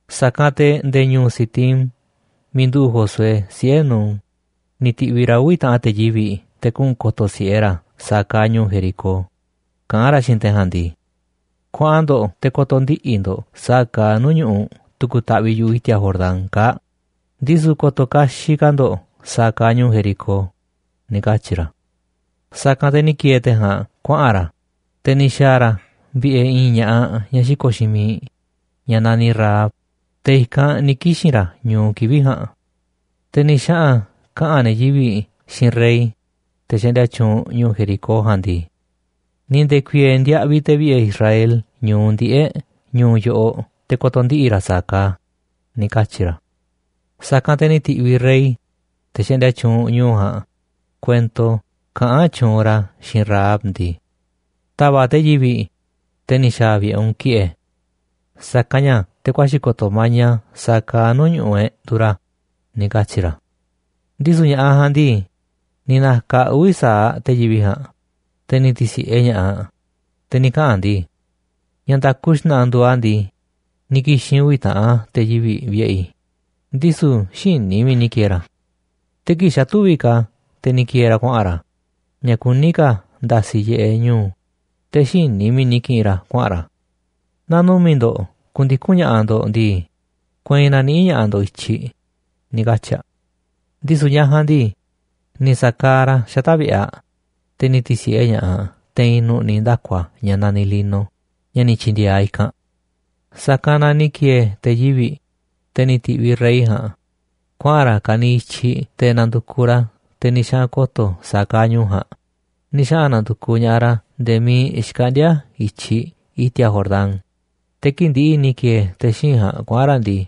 Sa̱kanꞌ te̱ nde̱e̱ ñu̱u̱ Sitim miiꞌ nduꞌu̱ꞌ Josué, siꞌe̱ Nun, ni̱ ti̱ꞌviꞌ ra̱ uvi̱ taꞌanꞌ te̱ yivi̱ꞌ te̱ kuꞌu̱n ko̱to̱ si̱ꞌe ra̱ sa̱a̱ kaaꞌ ñu̱u̱ Jericó, kaꞌán ra̱ xiinꞌ te̱ ja̱a̱nꞌ ndii: ―Kuaꞌan ndo̱ꞌ te̱ ko̱to̱ ndiꞌi̱ ndo̱ꞌ sa̱a̱ kaaꞌ nuu̱ꞌ ñu̱ꞌuꞌ tu̱ku̱ taꞌviꞌ yu̱ꞌuꞌ i̱ti̱a̱ Jordán kaa̱ꞌ, ndisu̱ ko̱to̱ kaxiꞌ ka̱ ndo̱ꞌ sa̱a̱ kaaꞌ ñu̱u̱ Jericó ―ni̱ katyi̱ ra̱. Sa̱kanꞌ te̱ ni̱ ki̱e̱e̱ te̱ ja̱a̱nꞌ kuaꞌa̱n ra̱, te̱ ni̱ xa̱a̱ ra̱ vi̱ꞌe̱ i̱i̱n ña̱ꞌaꞌ ñaꞌ xiko̱ꞌ xiinꞌ miiꞌ ñaꞌ naniꞌ Rahab, te̱ i̱kanꞌ ni̱ kixi̱n ra̱ ñu̱u kivi̱ꞌ ja̱a̱nꞌ. Te̱ ni̱ xaꞌa̱n kaꞌa̱n ne̱ yivi̱ꞌ xiinꞌ rey, te̱ xaꞌndia tyuunꞌ ñu̱u̱ Jericó ja̱a̱nꞌ ndii: ―Ni̱ nde̱ku̱i̱e̱e̱ ndiaꞌviꞌ te̱ vi̱ꞌe̱ Israel ñu̱u ndiꞌe̱ꞌ ñu̱u̱ yoꞌoꞌ te̱ ko̱to̱ ndiꞌi̱ ra̱ sa̱a̱ kaaꞌ a̱ ―ni̱ katyi̱ ra̱. Sa̱kanꞌ te̱ ni̱ ti̱ꞌviꞌ rey, te̱ xaꞌndia tyuunꞌ ñu̱u̱ ja̱a̱nꞌ, kuento kaꞌán tyuunꞌ ra̱ xiinꞌ Rahab ndii: ―Ta̱va̱ꞌ te̱ yivi̱ꞌ, te̱ ni̱ xa̱a̱ vi̱ꞌe̱ u̱nꞌ, ki̱ꞌe̱, sa̱kanꞌ ña̱ te̱ ku̱a̱xi̱ ko̱to̱ maña sa̱a̱ kaaꞌ nuu̱ꞌ ñu̱ꞌuꞌ e̱ꞌ nduuꞌ ra̱ ―ni̱ katyi̱ ra̱. Ndisu̱ ña̱ꞌaꞌ ja̱a̱nꞌ ndii, ni̱ na̱ka̱ aꞌ uvi̱ sa̱aꞌ te̱ yivi̱ꞌ ja̱a̱nꞌ, te̱ ni̱ ti̱si̱ꞌe ña̱ꞌaꞌ, te̱ ni̱ kaꞌa̱n aꞌ ndii: ―Ña̱ nda̱ku xna̱ꞌa̱ nduuꞌ a̱ ndii, ni̱ ki̱xi̱n uvi̱ taꞌan te̱ yivi̱ vi̱ꞌe̱ i̱, ndisu̱ xïní i̱ miiꞌ ni̱ ki̱e̱e̱ ra̱. Te̱ kii̱ꞌ xa̱ tüviꞌ ka̱ te̱ ni̱ ki̱e̱e̱ ra̱ kuaꞌa̱n ra̱, ña̱ kuní ka̱ nda̱si̱ yiꞌeꞌ ñu̱u̱, te̱ xïní i̱ miiꞌ ni̱ ki̱ꞌi̱n ra̱ kuaꞌa̱n ra̱. Naaꞌ numi̱ꞌ ndo̱ꞌ ku̱ndiku̱n ña̱ꞌaꞌ ndo̱ꞌ ndii, kueinꞌ na̱niꞌi̱ꞌ ña̱ꞌaꞌ ndo̱ꞌ i̱tyiꞌ ―ni̱ katyi̱ aꞌ. Ndisu̱ ñaꞌ ja̱a̱nꞌ ndii, ni̱ sa̱kaaꞌ ra̱ xata̱ꞌ vi̱ꞌe̱ aꞌ, te̱ ni̱ ti̱si̱ꞌe ña̱ꞌaꞌ aꞌ te̱i̱n nu̱ꞌni̱ ndaku̱a̱ ña̱ naniꞌ lino ña̱ ni̱ tyi̱ndi̱e̱e̱ aꞌ i̱kanꞌ. Sa̱kanꞌ na ni̱ ki̱e̱e̱ te̱ yivi̱ꞌ, te̱ ni̱ ti̱ꞌviꞌ rey ja̱a̱nꞌ, kuaꞌa̱n ra̱ ka̱niiꞌ i̱tyiꞌ te̱ na̱ndu̱kuꞌ ra̱ te̱ ni̱ xaꞌa̱n ko̱to̱ sa̱a̱ kaaꞌ ñu̱u̱ ja̱a̱nꞌ. Ni̱ xaꞌa̱n na̱ndu̱kuꞌ ña̱ꞌaꞌ ra̱ nde̱e̱ miiꞌ xkaꞌndíá i̱tyiꞌ i̱ti̱a̱ Jordán, te̱ kii̱ꞌ ndi̱ꞌi̱ ni̱ ki̱e̱e̱ te̱ xíinꞌ ja̱a̱nꞌ kuaꞌa̱n ra̱ ndii,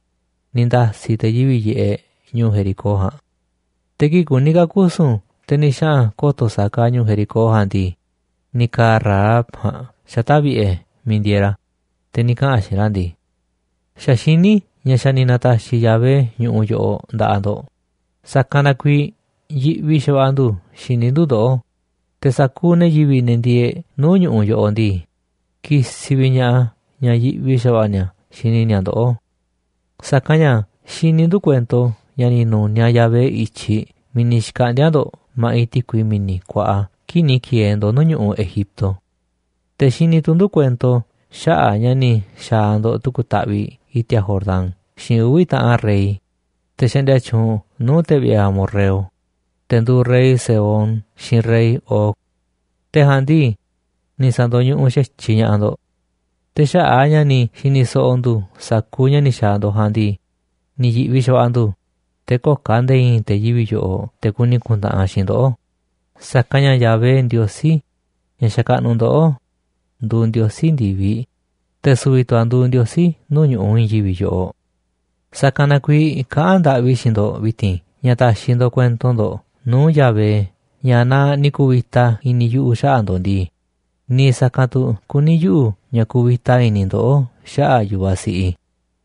ni̱ nda̱si̱ te̱ yivi̱ꞌ yiꞌeꞌ ñu̱u̱ Jericó ja̱a̱nꞌ. Te̱ kii̱ꞌ kuní ka̱ kusu̱n te̱ ni̱ xaꞌa̱n ko̱to̱ sa̱a̱ kaaꞌ ñu̱u̱ Jericó ja̱a̱nꞌ ndii, ni̱ ka̱a̱ Rahab ja̱a̱nꞌ xata̱ꞌ vi̱ꞌe̱ miiꞌ ndieeꞌ ra̱, te̱ ni̱ kaꞌa̱n aꞌ xiinꞌ ra̱ ndii: ―Xa̱ xiní i̱ ña̱ xa̱ ni̱ na̱ta̱xi̱ Yahvé ñu̱ꞌuꞌ yoꞌoꞌ nda̱ꞌaꞌ ndo̱ꞌ, sa̱kanꞌ na kuiiꞌ yiꞌvi xa̱va̱ꞌa̱ ndu̱ xini ndu̱ ndoꞌó, te̱ sa̱kuuꞌ ne̱ yiviꞌ, ne̱ ndieeꞌ nuu̱ꞌ ñu̱ꞌuꞌ yoꞌoꞌ ndii, kisiꞌ vi̱ꞌ ña̱ꞌaꞌ a̱ ña̱ yiꞌvi xa̱va̱ꞌa̱ ni̱a̱ xini ni̱a̱ ndoꞌó. Sa̱kanꞌ ña̱ xini ndu̱ kuento ña̱ ni̱ nu̱niaꞌ Yahvé i̱tyiꞌ miiꞌ ni̱ xkaꞌndi̱a̱ ndo̱ꞌ ma̱ꞌiꞌ ti̱kui mi̱ni̱ kuaꞌa kii̱ꞌ ni̱ ki̱e̱e̱ ndo̱ꞌ nuu̱ꞌ ñu̱ꞌuꞌ Egipto. Te̱ xini tu̱ ndu̱ kuento xaꞌa̱ꞌ ña̱ ni̱ xa̱a̱ ndo̱ꞌ tu̱ku̱ taꞌviꞌ i̱ti̱a̱ Jordán xiinꞌ uvi̱ ta̱ꞌan rey, te̱ xaꞌndia tyuunꞌ nuu̱ꞌ ne̱ vi̱ꞌe̱ amorreo, te̱ nduuꞌ rey Sehón xiinꞌ rey Og. Te̱ ja̱a̱nꞌ ndii, ni̱ sa̱ndo̱ñuꞌuꞌ xa̱tyiꞌ ña̱ꞌaꞌ ndo̱ꞌ. Te̱ xaꞌa̱ꞌ a̱ ña̱ ni̱ xi̱ni̱ so̱ꞌo̱ ndu̱ sa̱kuuꞌ ña̱ ni̱ xa̱a̱ ndo̱ꞌ ja̱a̱nꞌ ndii, ni̱ yi̱ꞌvi xa̱va̱ꞌa̱ ndu̱, te̱ köo̱ꞌ ka̱ nde̱e̱ i̱i̱n te̱ yivi̱ꞌ yoꞌoꞌ te̱ kuni ku̱ntaꞌanꞌ xiinꞌ ndoꞌó, sa̱kanꞌ ña̱ Yahvé, Ndiosí ña̱ xakaꞌnuꞌ ndoꞌó, nduuꞌ Ndiosí ndi̱viꞌ, te̱ su̱vi̱ tu̱ a̱ nduuꞌ Ndiosí nuu̱ꞌ ñu̱ꞌuꞌ i̱i̱n yivi̱ꞌ yoꞌoꞌ. ’Sa̱kanꞌ na kuiiꞌ kaꞌán ndaꞌvi i̱ xiinꞌ ndo̱ꞌ vi̱ti̱n ña̱ ta̱xi̱ ndo̱ꞌ kuento ndo̱ꞌ nuu̱ꞌ Yahvé ña̱ naa ni̱ ku̱vi̱ta i̱ni̱ yuꞌu̱ xaꞌa̱ꞌ ndo̱ꞌ ndii, niiꞌ sa̱kanꞌ tu̱ kuní yuꞌu̱ ña̱ ku̱vi̱ta i̱ni̱ ndoꞌó xaꞌa̱ꞌ yu̱vaꞌ siꞌiꞌ i̱.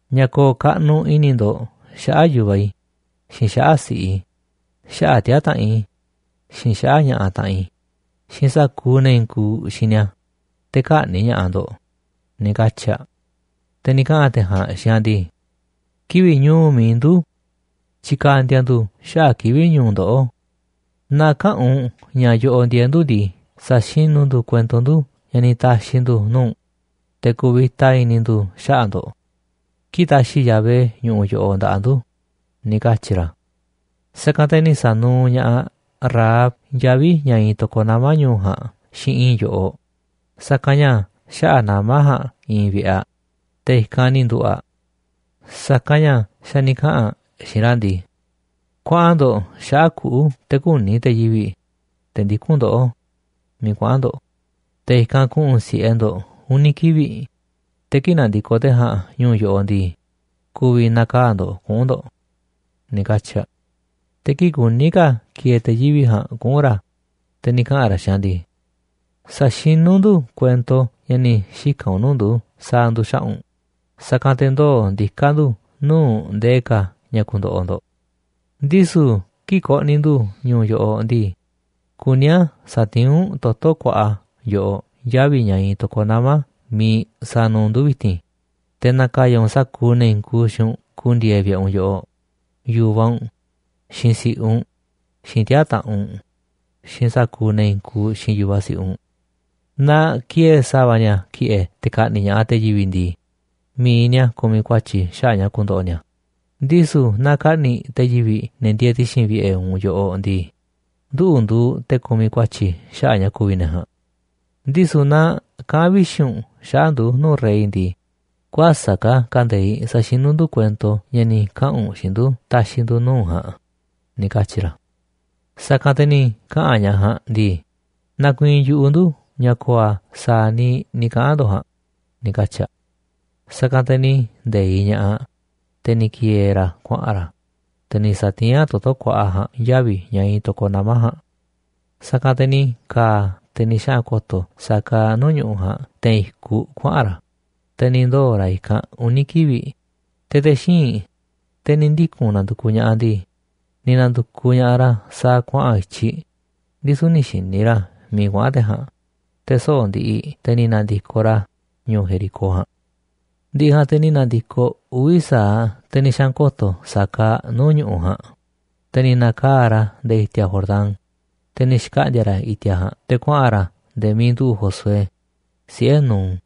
ña̱ ko̱o̱ kaꞌnuꞌ i̱ni̱ ndo̱ꞌ xaꞌa̱ꞌ yu̱vaꞌ i̱, xiinꞌ xaꞌa̱ꞌ si̱ꞌiꞌ i̱, xaꞌa̱ꞌ tiaa̱ taꞌanꞌ i̱, xiinꞌ xaꞌa̱ꞌ ña̱ꞌaꞌ taꞌanꞌ i̱, xiinꞌ sa̱kuuꞌ ne̱ i̱i̱n kuuꞌ xiinꞌ ni̱a̱, te̱ kä̱ꞌni̱ꞌ ña̱ꞌaꞌ ndo̱ꞌ ―ni̱ katyi̱ aꞌ. Te̱ ni̱ kaꞌa̱n te̱ ja̱a̱nꞌ xiinꞌ aꞌ ndii: ―Kivi̱ꞌ ñu̱u̱ mi̱iꞌ ndu̱ tyikandia ndu̱ xaꞌa̱ꞌ kivi̱ꞌ ñu̱u̱ ndoꞌó. Naaꞌ käꞌa̱n u̱nꞌ ña̱ yoꞌoꞌ ndieeꞌ ndu̱ ndii, sa̱xinú ndu̱ kuento ndu̱ ña̱ ni̱ ta̱xi̱ ndu̱ nuu̱ꞌ u̱nꞌ, te̱ ku̱vi̱ta i̱ni̱ ndu̱ xaꞌa̱ꞌ ndo̱ꞌ kii̱ꞌ ta̱xi̱ Yahvé ñu̱ꞌuꞌ yoꞌoꞌ nda̱ꞌaꞌ ndu̱ ―ni̱ katyi̱ ra̱. Sa̱kanꞌ te̱ ni̱ sa̱nuuꞌ ña̱ꞌaꞌ Rahab yavi̱ ña̱ iinꞌ to̱koꞌ nama̱ ñu̱u̱ ja̱a̱nꞌ xiinꞌ i̱i̱n yo̱ꞌoꞌ, sa̱kanꞌ ña̱ xaꞌa̱ꞌ nama̱ ja̱a̱nꞌ iinꞌ vi̱ꞌe̱ aꞌ, te̱ i̱kanꞌ ni̱ nduꞌu̱ꞌ aꞌ. Sa̱kanꞌ ña̱ xa̱ ni̱ kaꞌa̱n aꞌ xiinꞌ ra̱ ndii: ―Kuaꞌan ndo̱ꞌ xaꞌa̱ꞌ kuꞌu̱ te̱ kü̱ni̱ te̱ yivi̱ꞌ, te̱ ndikún ndoꞌó, miiꞌ kuaꞌa̱n ndo̱ꞌ, te̱ i̱kanꞌ ku̱ꞌu̱n si̱ꞌe ndo̱ꞌ uni̱ kivi̱ꞌ, te̱ kii̱ꞌ na̱ndi̱koꞌ te̱ ja̱a̱nꞌ ñu̱u̱ yoꞌoꞌ ndii, ku̱vi̱ na̱kaa̱ꞌ ndo̱ꞌ kuꞌu̱n ndo̱ꞌ ―ni̱ katyi̱ aꞌ. Te̱ kii̱ꞌ kuní ka̱ ki̱e̱e̱ te̱ yivi̱ꞌ ja̱a̱nꞌ kuꞌu̱n ra̱, te̱ ni̱ kaꞌa̱n ra̱ xiinꞌ aꞌ ndii: ―Sa̱xinú ndu̱ kuento ña̱ ni̱ xika̱n u̱nꞌ nuu̱ꞌ ndu̱ sa̱a̱ ndu̱ xaꞌa̱ꞌ u̱nꞌ, sa̱kanꞌ te̱ ndoo̱ ndiká ndu̱ nuu̱ꞌ ndee ka̱ ña̱ ku̱ndo̱ꞌo̱ ndo̱ꞌ. Ndisu̱ kii̱ꞌ ko̱ꞌni̱ ndu̱ ñu̱u̱ yoꞌoꞌ ndii, kuní a̱ sa̱tiín u̱nꞌ toto̱ kuaꞌa yoꞌoꞌ yavi̱ ña̱ iinꞌ to̱koꞌ nama̱ miiꞌ sa̱nuuꞌ u̱nꞌ ndu̱ vi̱ti̱n, te̱ na̱ka̱ya̱ u̱nꞌ sa̱kuuꞌ ne̱ i̱i̱n kuuꞌ xiinꞌ u̱nꞌ ku̱ndi̱e̱e̱ vi̱ꞌe̱ u̱nꞌ yoꞌoꞌ, yu̱vaꞌ u̱nꞌ, xiinꞌ si̱ꞌiꞌ u̱nꞌ, xiinꞌ tiaa̱ taꞌanꞌ u̱nꞌ, xiinꞌ sa̱kuuꞌ ne̱ i̱i̱n kuuꞌ xiinꞌ yu̱vaꞌ siꞌiꞌ u̱nꞌ. Naaꞌ ki̱e̱e̱ sa̱va̱ ni̱a̱ ki̱ꞌe̱ te̱ ka̱ꞌni̱ꞌ ña̱ꞌaꞌ te̱ yivi̱ꞌ ndii, mi̱iꞌ ni̱a̱ kumiꞌ ku̱a̱tyi̱ xaꞌa̱ꞌ ña̱ ku̱ndo̱ꞌo̱ ni̱a̱, ndisu̱ naaꞌ ka̱ꞌni̱ꞌ te̱ yivi̱ꞌ ne̱ ndieeꞌ ti̱xi̱n vi̱ꞌe̱ u̱nꞌ yoꞌoꞌ ndii, nduꞌu̱ nduuꞌ te̱ ku̱miꞌ ku̱a̱tyi̱ xaꞌa̱ꞌ ña̱ ku̱vi̱ ne̱ ja̱a̱nꞌ. Ndisu̱ naaꞌ kaꞌa̱n vixi̱ u̱nꞌ xaꞌa̱ꞌ ndu̱ nuu̱ꞌ rey ndii, kuäsa̱ꞌ ka̱ kande̱iꞌ sa̱xinú ndu̱ kuento ña̱ ni̱ kaꞌa̱n u̱nꞌ xiinꞌ ndu̱ ta̱xi̱ ndu̱ nuu̱ꞌ u̱nꞌ ja̱a̱nꞌ ―ni̱ katyi̱ ra̱. Sa̱kanꞌ te̱ ni̱ kaꞌa̱n ñaꞌ ja̱a̱nꞌ ndii: ―Nakuiinꞌ yu̱ꞌuꞌ ndu ña̱ ko̱o̱ a̱ sa̱a̱ niiꞌ ni̱ kaꞌa̱n ndo̱ꞌ ja̱a̱nꞌ ―ni̱ katyi̱ aꞌ. Sa̱kanꞌ te̱ ni̱ nde̱iꞌ ña̱ꞌaꞌ aꞌ, te̱ ni̱ ki̱e̱e̱ ra̱ kuaꞌa̱n ra̱, te̱ ni̱ sa̱tiín aꞌ toto̱ kuaꞌa ja̱a̱nꞌ yavi̱ ña̱ iinꞌ to̱koꞌ nama̱ ja̱a̱nꞌ. Sa̱kanꞌ te̱ ni̱ ka̱a̱ te̱ ni̱ xaꞌa̱n ko̱to̱ sa̱a̱ kaaꞌ nuu̱ꞌ ñu̱ꞌuꞌ ja̱a̱nꞌ te̱i̱n i̱kuꞌ kuaꞌa̱n ra̱, te̱ ni̱ ndoo̱ ra̱ i̱kanꞌ uni̱ kivi̱ꞌ, te̱ te̱ xíinꞌ, te̱ ni̱ ndiku̱n nandukuꞌ ña̱ꞌaꞌ ndii, ni̱ na̱ndu̱kuꞌ ña̱ꞌaꞌ ra̱ sa̱a̱ kuaꞌa̱n i̱tyiꞌ, ndisu̱ nï̱ xi̱ni̱ ra̱ miiꞌ kuaꞌa̱n te̱ ja̱a̱nꞌ. Te̱ soꞌo̱ꞌ ndiꞌiꞌ, te̱ ni̱ na̱ndi̱koꞌ ra̱ ñu̱u̱ Jericó ja̱a̱nꞌ. Ndi̱ꞌi̱ ja̱a̱nꞌ te̱ ni̱ na̱ndi̱koꞌ uvi̱ sa̱aꞌ te̱ ni̱ xaꞌa̱n ko̱to̱ sa̱a̱ kaaꞌ nuu̱ꞌ ñu̱ꞌuꞌ ja̱a̱nꞌ, te̱ ni̱ na̱kaa̱ꞌ ra̱ nde̱e̱ i̱ti̱a̱ Jordán, te̱ ni̱ xkaꞌndi̱a̱ ra̱ i̱ti̱a̱ ja̱a̱nꞌ te̱ kuaꞌa̱n ra̱ nde̱e̱ miiꞌ nduꞌu̱ꞌ Josué, siꞌe̱ Nun.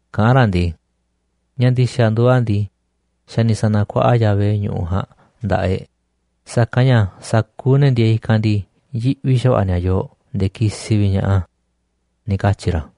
kaꞌán ra̱ ndii: ―Ña̱ ndi̱xa̱ nduuꞌ a̱ ndii, xa̱ ni̱ sa̱na̱kuaꞌa Yahvé ñu̱ꞌuꞌ ja̱a̱nꞌ nda̱ꞌaꞌ e̱ꞌ, sa̱kanꞌ ña̱ sa̱kuuꞌ ne̱ ndieeꞌ i̱kanꞌ ndii, yiꞌvi xa̱va̱ꞌa̱ ni̱a̱ yooꞌ nde̱e̱ kisiꞌ vi̱ꞌ ña̱ꞌaꞌ a̱ ―ni̱ katyi̱ ra̱.